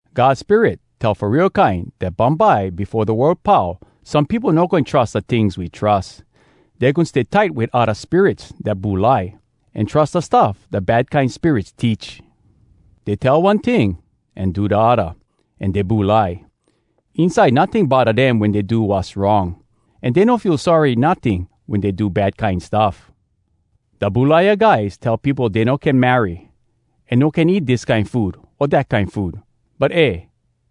God Spirit tell fo real kine dat bumbye befo da world pau some peopo no goin trus da tings we trus. Dey goin stay tight wit odda spirits dat bulai, an trus da stuff da bad kine spirits teach. Dey tell one ting an do da odda, an dey bulai. Inside notting bodda dem wen dey do wass wrong, an dey no feel sorry notting wen dey do bad kine stuff. Da bulaia guys tell peopo dey no can marry, an no can eat dis kine food o dat kine food. But eh,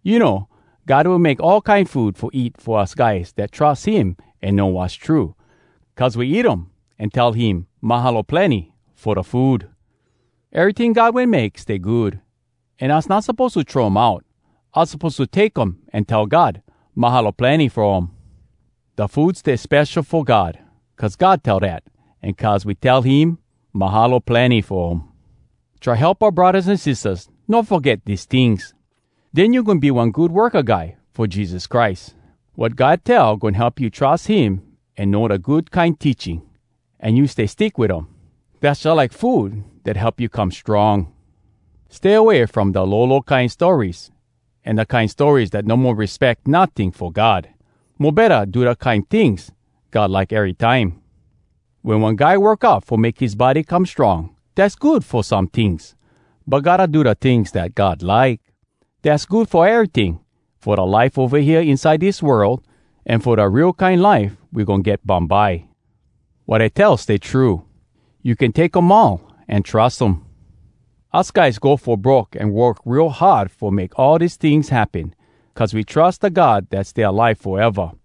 you know, God wen make all kine food fo eat fo us guys dat trus him an know wass true, cuz we eat um an tell him “Mahalo plenny!” fo da food. Eryting God wen make stay good. An us not suppose to throw um out. Us suppose to take um an tell God “Mahalo plenny!” fo um. Da food stay spesho fo God, cuz God tell dat, an cuz we tell him “Mahalo plenny!” fo um. Try help oua braddahs an sistahs no foget dis tings. Den you goin be one good worka guy fo Jesus Christ. Wat God tell goin help you trus him an know da good kine teaching. An you stay stick wit um. Dass jalike food dat help you come strong. Stay away from da lolo kine stories an da kine stories dat no mo respeck notting fo God. Mo betta, do da kine tings God like erytime. Wen one guy work out fo make his body come strong, dass good fo some tings. But gotta do da tings dat God like. Dass good fo eryting, fo da life ova hea inside dis world, an fo da real kine life we goin get bumbye. Wat I tell stay true. You can take um all an trus um. Us guys go fo broke an work real hard fo make all dis tings happen. Cuz we trus da God dat stay alive foeva.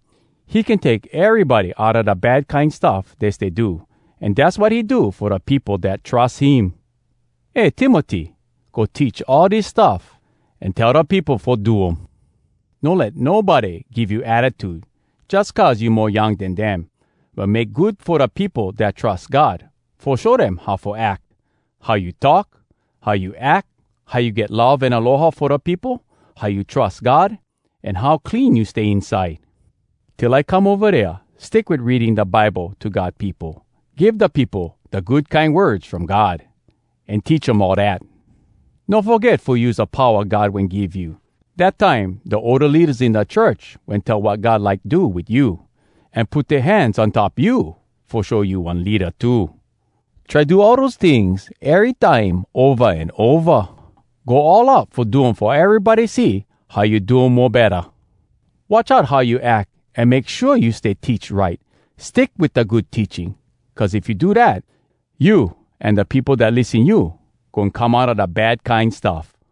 He can take erybody outa da bad kine stuff dey stay do, an dass wat he do fo da peopo dat trus him. Eh Timoty! Go teach all dis stuff, an tell da peopo fo do um. No let nobody give you attitude jus cuz you mo young den dem, but make good fo da peopo dat trus God fo show dem how fo ack—how you talk, how you ack, how you get love an aloha fo da peopo, how you trus God, an how clean you stay inside. Till I come ova dea, stick wit reading da Bible to God peopo, give da peopo da good kine words from God, an teach um all dat. No foget fo use da powa God wen give you, dat time da older leadas in da church wen tell wat God like do wit you, an put dea hands on top you fo show you one leada too. Try do all dose tings erytime ova an ova. Go all out fo do um fo erybody see how you do um mo betta. Watch out how you ack an make shua you stay teach right. Stick wit da good teaching. Cuz if you do dat, you an da peopo dat lissen you goin come outa da bad kine stuff.